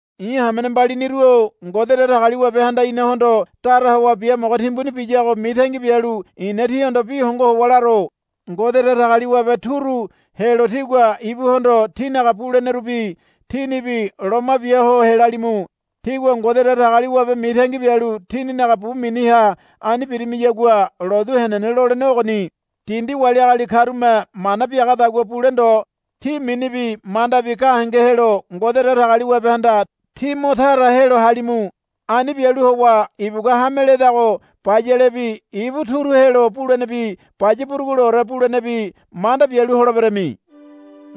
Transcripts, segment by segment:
I̱ hamene mbaliniru-o Ngode Datagaliwabehanda inahondo dara howa biamogo timbuni biyago mitangi bialu i̱na tíhondo bi hongo howa laro. Ngode Datagaliwabe turu helo tígua ibuhondo tínaga bulenerubi tínibi loma bia ho helalimu. Tígua Ngode Datagaliwabe mitangi bialu tíninaga bu miniha ani birimiyagua lotu henene lolenego ogoni. Dindi wali agali karume mana biagadagua bule ndo. Tí minibi mandabi gahenge helo Ngode Datagaliwabehanda tí mo tara helo halimu. Ani bialu howa ibugua hame ledago bayalebi ibu turu helo bulenebi baya buruguleore bulenebi manda bialu holeberami.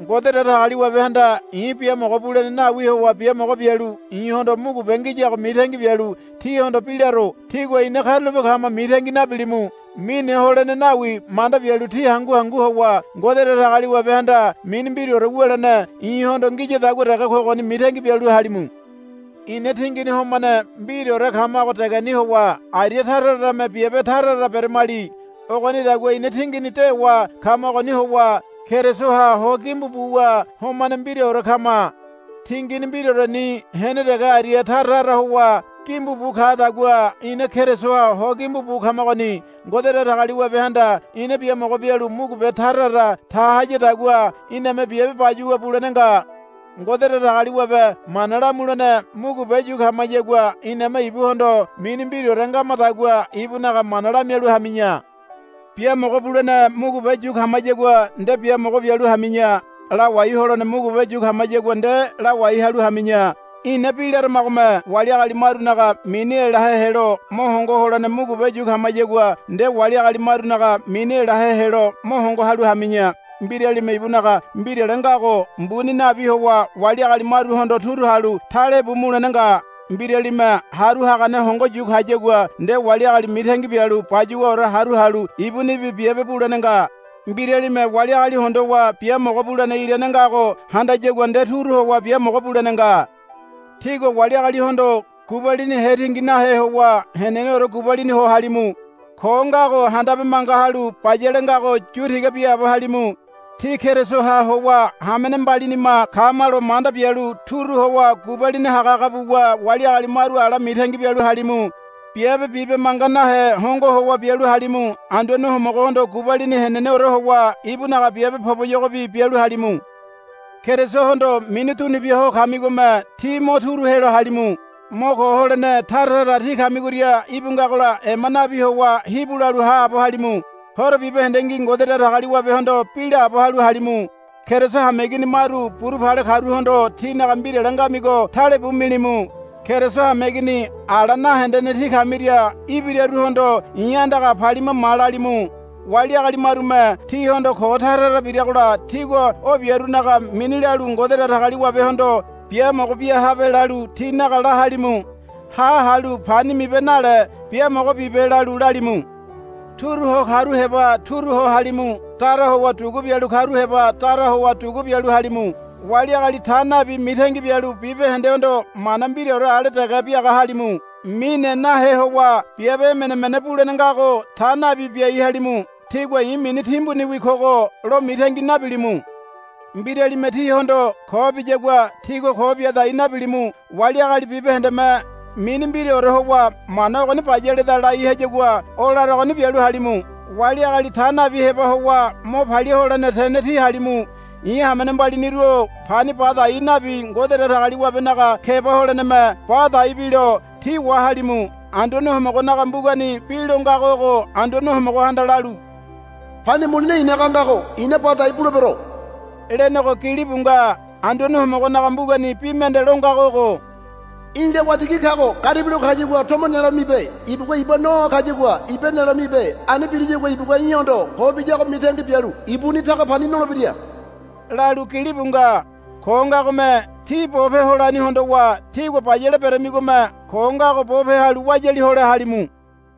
Ngode Datagaliwabehanda i̱ biamogo bulene nawi howa biamogo bialu i̱hondo mugube ngiyago mitangi bialu tíhondo bi laro. Tígua, Ina karulape kama, mitangi nabilimu. Mine holene nawi manda bialu tí hangu hangu howa, Ngode Datagaliwabehanda mini mbiraore wulene i̱hondo ngiyadagua dege kogoni, mitangi bialu halimu. Ina tingini homane mbiraore kamago degeni howa aria tara tarame biabe tara tara beremali. Ogonidagua ina tingini dewa kamagoni howa Kerisoha ho gimbu buwa homane mbiraore kama. Tingini mbiraoreni hene dege aria tara tara howa gimbu bu kadagua ina Kerisoha ho gimbu bu kamagoni. Ngode Datagaliwabehanda ina biamogo bialu mugube tara tara ta hayadagua iname biabe bayuwa bulene nga. Ngode Datagaliwabe mana lamulene mugube yu kamayagua iname ibuhondo mini mbiraore ngamadagua ibunaga mana lamialu hami̱ya. Biamogo bulene mugube yu kamayagua nde biamogo bialu hami̱ya. Lawai holene mugube yu kamayagua nde lawai halu hami̱ya. Ina bi laramagome wali agali marunaga mini elahe helo mo hongo holene mugube yu kamayagua nde wali agali marunaga mini elahe helo mo hongo halu hami̱ya. Mbiralime ibunaga mbirale ngago mbuni nabi howa wali agali maruhondo turu halu talebu mulene nga. Mbiralime haru hagane hongo yu kayagua nde wali agali mitangi bialu bayuwaore haru halu ibunibi biabe bulene nga. Mbiralime wali agali hondowa biamogo bulene irane ngago handayagua nde turu howa biamogo bulene nga. Tígua wali agalihondo gubalini hetingi nahe howa heneneore gubalini ho halimu. Ko ngago handabe manga halu bayale ngago yu tiga biaabo halimu. Tí Kerisoha howa hamene mbalinima kamalo manda bialu turu howa gubalini hagahaga buwa wali agali maru ala mitangi bialu halimu. Biabe bibe manga nahe hongo howa bialu halimu. Anduane Homogohondo gubalini heneneore howa ibunaga biabe poboyogobi bialu halimu. Kerisohondo mini dunubia ho kamigome tí mo turu helo halimu. Mo ko holene tara tara tí kamigoria íbu ngagola ema nabi howa hibu lalu haabo halimu. Horo bibahendengi Ngode Datagaliwabehondo bi laabo halu halimu. Keriso hameigini maru buru pale karuhondo tínaga mbirale ngamigo talebu milimu. Keriso hameigini ala nahendene tí kamiria ibiraruhondo, I̱ andaga palima ma, lalimu. Wali agali marume tíhondo ko tara tara biragola tígua o biarunaga mini lalu Ngode Datagaliwabehondo, Biamogo bia habe, lalu tinaga la halimu. Ha halu pani mibe nale, Biamogo bibe, lalu lalimu. Turu ho karu heba turu ho halimu. Dara howa dugu bialu karu heba dara howa dugu bialu halimu. Wali agali ta nabi mitangi bialu bibahendehondo mana mbiraore ale dege biaga halimu. Mine nahe howa biabe emene emene bulene ngago ta nabi biai halimu. Tígua, I̱ mini timbuniwi kogo, lo mitangi nabilimu. Mbiralime tíhondo ko biyagua tígua ko bia dai nabilimu. Wali agali bibahendeme mini mbiraore howa, Mana ogoni bayaleda, lai hagayagua o laragoni bialu halimu. Wali agali ta nabi heba howa mo palia holene tene tí halimu. I̱ hamene mbaliniru-o pani ba dai nabi Ngode Datagaliwabenaga keba holeneme ba dai bilo tí wahalimu. Anduane Homogonaga mbugani bi lo ngago ogo, Anduane Homogohanda lalu, Pani mulene i̱naga ngago i̱na ba dai bulebero, lenego, gilibu nga. Anduane Homogonaga mbugani bi mende lo ngago ogo, Í̠la waitigi kago garibilo kayagua tomo nelo mibe. Ibugua iba noa ho kayagua iba nelo mibe. Ani biriyagua ibugua í̠hondo ko biyago mitangi bialu ibuni taga pani nolebira, lalu gilibu nga. Ko ngagome tí bope holani hondowa tígua bayale beramigome ko ngago bope halu wayali hole halimu.